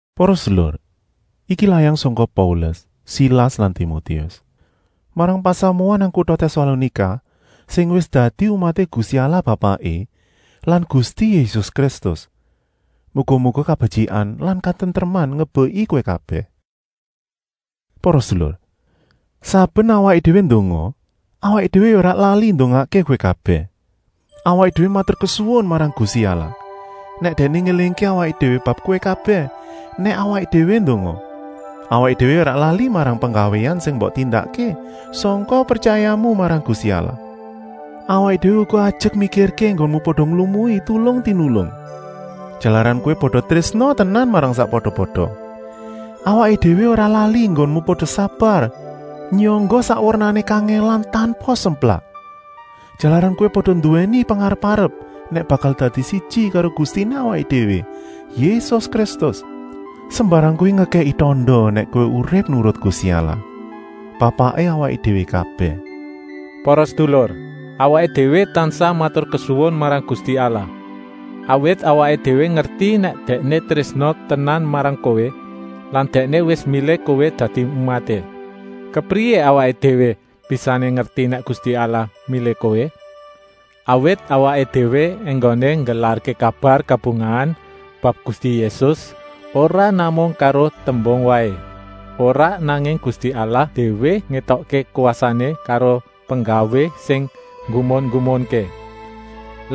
Para sedulur, iki layang sangka Paulus, Silas lan Timotius, marang pasamuan nang kuta Tèsalonika sing wis dadi umaté Gusti Allah Bapaké lan Gusti Yésus Kristus. Muga-muga kabetyikan lan katentreman ngebeki kowé kabèh. Para sedulur, saben awaké déwé ndonga, awaké déwé ya ora lali ndongakké kowé kabèh. Awaké déwé maturkesuwun marang Gusti Allah nèk Dèkné ngélingké awaké déwé bab kowé kabèh nèk awaké déwé ndonga. Awaké déwé ya ora lali marang penggawéan sing mbok tindakké sangka pretyayamu marang Gusti Allah. Awaké déwé uga ajek mikirké enggonmu pada nglumui tulung-tinulung, jalaran kowé pada trésna tenan marang sakpada-pada. Awaké déwé ora lali enggonmu pada sabar nyangga sak wernané kangèlan tanpa semplak, jalaran kowé pada nduwèni pengarep-arep nèk bakal dadi siji karo Gustiné awaké déwé, Yésus Kristus. Sembarang kuwi ngekèki tanda nèk kowé urip nurut Gusti Allah, Bapaké awaké déwé kabèh. Para sedulur, awaké déwé tansah maturkesuwun marang Gusti Allah, awit awaké déwé ngerti nèk Dèkné trésna tenan marang kowé lan Dèkné wis milih kowé dadi umaté. Kepriyé awaké déwé bisané ngerti nèk Gusti Allah milih kowé? Awit awaké déwé enggoné nggelarké kabar kabungahan bab Gusti Yésus ora namung karo tembung waé, ora, nanging Gusti Allah déwé ngétokké kwasané karo penggawé sing nggumun-nggumunké.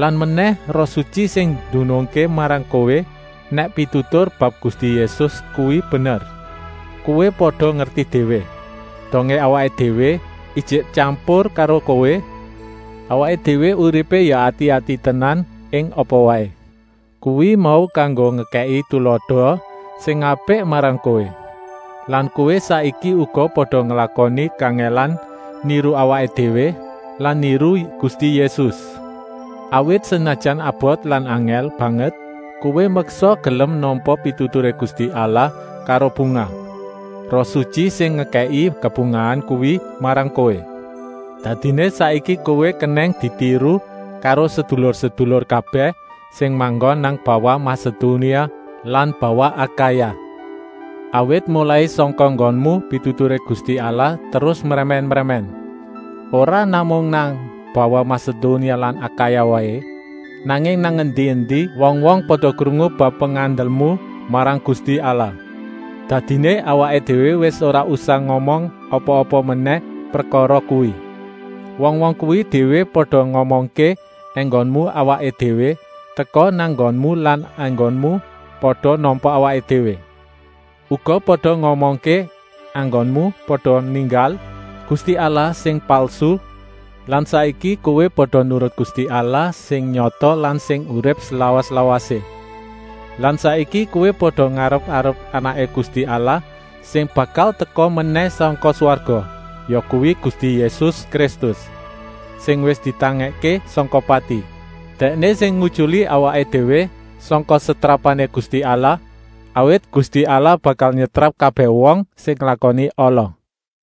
Lan menèh, Roh Sutyi sing ndunungké marang kowé nèk pitutur bab Gusti Yésus kuwi bener. Kowé pada ngerti déwé, dongé awaké déwé ijik tyampur karo kowé, awaké déwé uripé ya ati-ati tenan ing apa waé. Kuwi mau kanggo ngekèki tulada sing apik marang kowé. Lan kowé saiki uga pada nglakoni kangèlan niru awaké déwé lan niru Gusti Yésus. Awit, senajan abot lan angèl banget, kowé meksa gelem nampa pituturé Gusti Allah karo bungah. Roh Sutyi sing ngekèki kabungahan kuwi marang kowé. Dadiné saiki kowé kenèng ditiru karo sedulur-sedulur kabèh sing manggon nang bawah Masedonia lan bawah Akaya. Awit molai sangka nggonmu pituturé Gusti Allah terus mrèmèn-mrèmèn. Ora namung nang bawah Masedonia lan Akaya waé, nanging nang endi-endi wong-wong pada krungu bab pengandelmu marang Gusti Allah. Dadiné awaké déwé wis ora usah ngomong apa-apa menèh prekara kuwi. Wong-wong kuwi déwé pada ngomongké enggoné awaké déwé teka nang nggonmu lan enggonmu pada nampa awaké déwé. Uga pada ngomongké enggonmu pada ninggal gusti allah sing palsu lan saiki kowé pada nurut Gusti Allah sing nyata lan sing urip slawas-lawasé. Lan saiki kowé pada ngarep-arep Anaké Gusti Allah sing bakal teka menèh sangka swarga, yakuwi Gusti Yésus Kristus, sing wis ditangèkké sangka pati. Dèkné sing ngutyuli awaké déwé sangka setrapané Gusti Allah, awit Gusti Allah bakal nyetrap kabèh wong sing nglakoni ala.